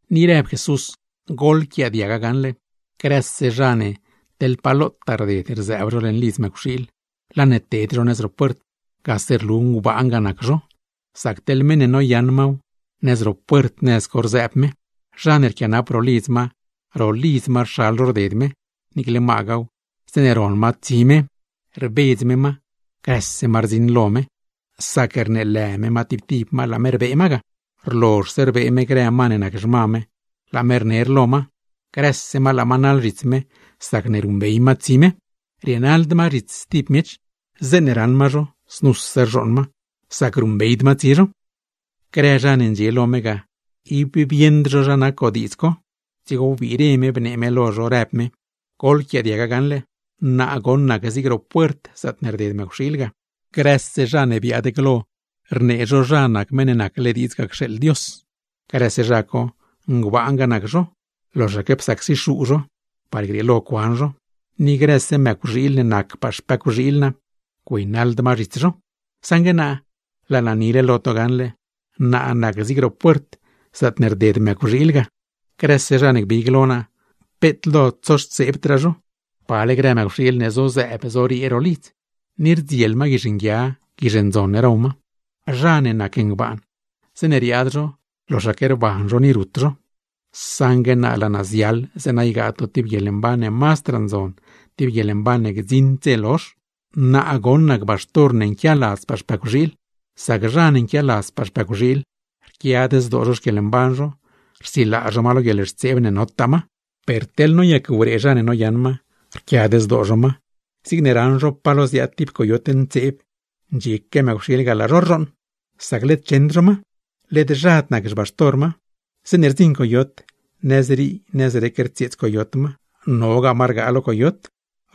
Ni rëb Jesús: ―Goḻquiaadiaga gaṉle: grëse zha rded stib nëz zeeṉe rzëëb zho leṉ lidz mëcwxiil, laa ne ted zho nëz ro puert, gase rlu ngbaan ga nac zho; sac teḻ meṉ ne noyaṉ maw, nëz ro puert nëz co rzëëb me. Zha ne rquianap ro lidz ma, ga rxal zho rded me; niicle magaaw, zeeṉe ron ma tsi me, grëse ma rdziṉ lo me; dzigo rbedz me ma, rneelë me ma tib tib ma, laa me rbee ma ga. Rlozhse rbee me grë ma ne nac xma me, laa me rner lo ma; grëse ma laa ma rnaḻ zhits me sacne ruṉbey ma tsi me. Rienaḻd ma zhits stib miech, zeeṉe raṉ ma zho znuse rzhooṉ ma; sac ruṉbeyd ma tsi zho. Grë zha ne ndxie lo me ga, ib bieṉd zho zha nac godiidz co; dzigo wbiire me bnee me lo zho, rëb me: ―Goḻquiaadiaga gaṉle: Naa goṉ nac zig ro Puert, zaatne rded mëcwxiil ga. Grëse zha ne biaad glo rnee zho zha nac Meṉ ne nacle diidz cxeeḻ Dios ga, grëse zha co ngbaan ga nac zho, loxaque psacsi zho par grieelo cuan zho; ni grëse mëcwxiil ne nacpaa xpëcwxiil naa, güeynaḻd ma zhits zho. Saṉgue naa, laa naa nile lo to gaṉle: Naa nac zig ro Puert, zaatne rded mëcwxiil ga. Grëse zha ne gbig lo naa, zlaa zho, peet lo tsoxtseebdraa zho; pale grë mëcwxiil ne zozëëb zoriee ro lidz, ni rdziel ma guizh nguia, guizh ndzon row ma. Zha ne nac ngbaan, zeeṉe riaad zho loxaque rban zho ni rut zho; saṉgue naa, laa naa ziaḻ zeeṉa ygaa to tib guieḻmban ne mazdraa ndzon, tib guieḻmban ne gdziṉd dze lozh. ’Naa nac Baxtor ne nquialadzpaa xpëcwxiil. Sac zha ne nquialadzpaa xpëcwxiil, rquiad zdoo zho xquieḻmban zho, rsilaa zho ma lo guieḻxtseeb ne notaa ma. Per teḻ noyac-wree zha ne noyaṉ ma, rquiad zdoo zho ma, zigne raṉ zho palo ziaad tib coyot ntseeb, ndxieque mëcwxiil ga laa zho rzhooṉ; sac led cheṉd zho ma, led zhad nac xbaxtor ma. Zeeṉe rdziṉ coyot, nëzrii nëzrec rtsieets coyot ma, nogaa ma rgaa lo coyot.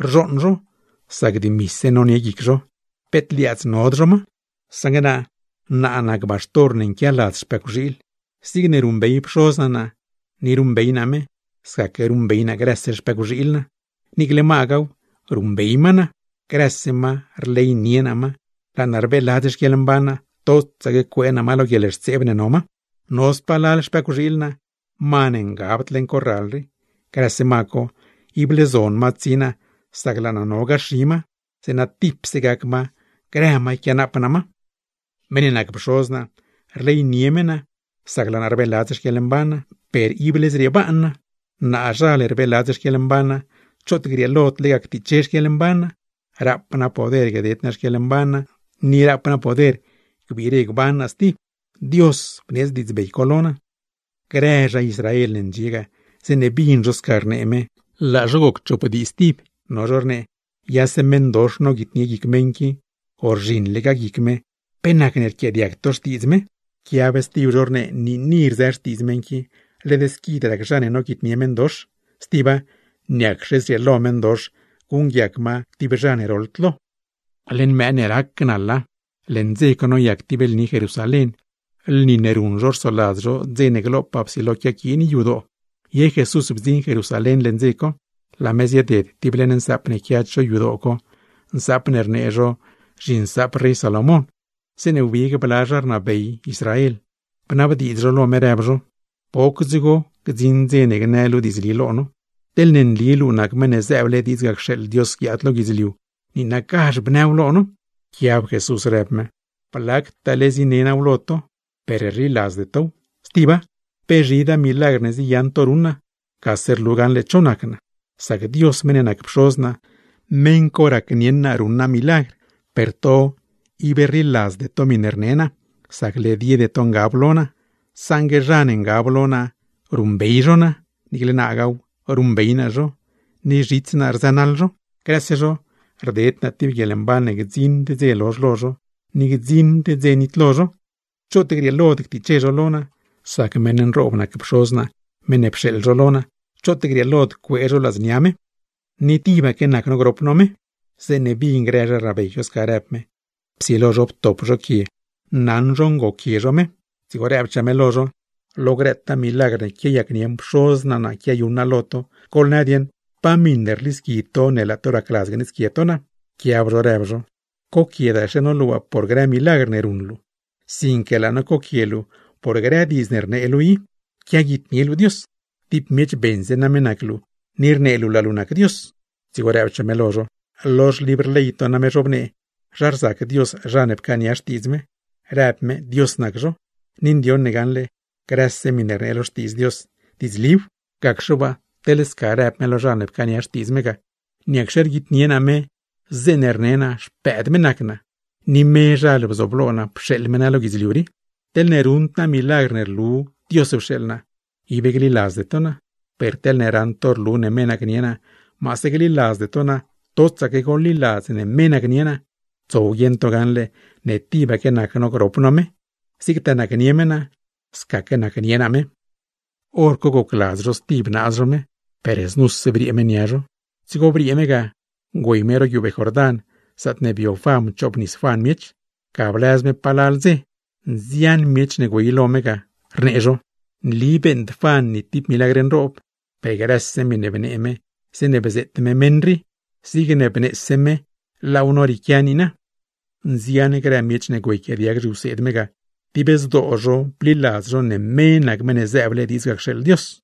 Rzhooṉ zho, sac dimise nonie guic zho, peet liaadz nod zho ma. Naa nac Baxtor ne nquialadz xpëcwxiil. Zigne ruṉbey Pxoz naa naa ni ruṉbey naa me, sca ruṉbey naa grëse xpëcwxiil naa, niicle magaaw ruṉbey ma naa. Grëse ma, rleynie naa ma, laa naa rbeeladz xquieḻmban naa totsaque cuee naa ma lo guieḻxtseeb ne no ma. ’No spalal xpëcwxiil naa, ma ne ngabd leṉ corral rii; grëse ma co, ible zon ma tsi naa sac laa naa no gaxi ma, zeeṉa tipse gac ma grë ma yquianaap naa ma. ’Meṉ ne nac Pxoz naa, rleynie me naa sac laa naa rbeeladz xquieḻmban naa; per ible zriebaan naa. Naazhal rbeeladz xquieḻmban naa, choot grieelod lega ctiche xquieḻmban naa. Rap naa poder gded naa xquieḻmban naa, ni rap naa poder gbire gban naa stib. Dios bneedz diidzbey co lo naa. Grë zha Israel ne ndxie ga, zeeṉe bin zho sca rnee me, laa zho goc chop dii stib. No zho rnee: ―Yase meṉdox noguitnie guic meṉ qui, o rzhiṉlegaa guic me. ¿Pe nacne rquiaadiag to xtiidz me? Rquiab stib zho rnee: ―Niini rzë xtiidz meṉ qui, led squid rac zha ne noguitnie meṉdox. Stiba, ¿niacxe zrieelo meṉdox guṉguiac ma tib lo zha ne roḻd lo? Leṉ mëë ne rac naḻa, leṉ dze co noyac tib lni Jerusalén, lni ne ruṉ zho rsoladz zho dze ne glopaa psilo quiaquiin yadoo. Ye Jesús bdziṉ Jerusalén leṉ dze co. Laa me zieded tib leṉ nsaap ne quia cho yadoo co, nsaap ne rnee zho zhiNsaap rey Salomón; zeeṉe wbig bla zha ne rnabey Israel, bnabdiidz zho lo me rëb zho: ―¿Poc dzigo gdziṉ dze ne gnë luu diidzli lo no? Teḻne nli luu nac Meṉ ne zëëble diidz ga cxeeḻ Dios guiaad lo guidzliu, niinagazh bnëw lo no. Pquiab Jesús rëb me: ―Blactaale zine naaw lo to, per rliladzde tow. Stiba, pe zhidaa milagr ne ziyaṉ to ruṉ naa, gase rlu gaṉle cho nac naa; sac Dios meṉ ne nac Pxoz naa, meṉ co racnieṉ naa ruṉ naaw. Ib rliladzde tow, sacne led yede to ngab lo naa. Teḻ zha ne ngab lo naaw, ruṉbey zho naa; niicle naagaaw ruṉbey naa zho, ni zhits naa rzënaḻ zho. Grëse zho, rded naa tib guieḻmban ne gdziṉd dze lozh lo zho, ni gdziṉd dze nitlo zho. Choot grieelod ctiche zho lo naa, sac meṉ nroob nac Pxoz naa meṉ ne pxeeḻ zho lo naa; choot grieelod cuee zho ladznia me. Ni tibaque nac no grop no me. Zeeṉe bin grë zha rnabey co sca rëb me, psilo zho ptop zho quie naṉ zho ngoquie zho me. Dzigo rëbchaa me lo zho: ―Lo grëtaa milagr ne quiayacnieṉ Pxoz naa naa quiayuṉ naa lo to. Goḻnë dieṉ, ¿pa miṉ rlisqui to ne laa to racladz gneedzquie to naa? Pquiab zho rëb zho: ―¡Coquiedaxe no luu waa por grë milagr ne ruṉ luu, sinque laa no coquie luu por grë diidz ne rnee luu i, quiaguitnie luu Dios! ¡Tib miech beṉse name nac luu, ni rnee luu laa luu nac Dios! Dzigo rëbchaa me lo zho: ―¡Lo xlibr ley to name zhobnee zha rzac Dios zha ne pcaania xtiidz me, rëb me dios nac zho! Ni ndioṉ ne gaṉle, grëse miṉe rnee lo Xtiidz Dios, diidzliw; gacxe waa teḻ sca rëb me lo zha ne pcaania xtiidz me ga, ¿niacxe rguitnie naa me ga, zeeṉe rne naa Xpëëd me nac naa, ni mezhal bzooblo naa pxeeḻ me naa lo guidzliu rii? Teḻne ruṉd naa milagr ne rlu Dios pxeeḻ naa, ib gliladzde to naa. Per teḻne raṉ to rlu ne me nacnie naa, maase gliladzde to naa totsaque goḻliladz ne me nacnie naa; tsow guieṉ to gaṉle ne tibaque nac no grop no me, zigtaa nacnie me naa, scaque nacnie naa me. Horco gocladz zho stib naaz zho me, per znuse briee me nia zho. Dzigo briee me ga güey me ro guiubee Jordán, zaatne bio Juan pchoobnis Juan miech; ga blëz me palal dze. Nzian miech ne güey lo me ga, rnee zho: ―Nli beeṉd Juan ni tib milagr nroob, per grëse miṉe bnee me zeeṉe bzeet me meṉ rii, zigne bneese me laaw norieequia niina. Nzian grë miech ne güeyquiaadiag zhiwseed me ga, dib zdoo zho bliladz zho ne me nac Meṉ ne zëëble diidz ga cxeeḻ Dios.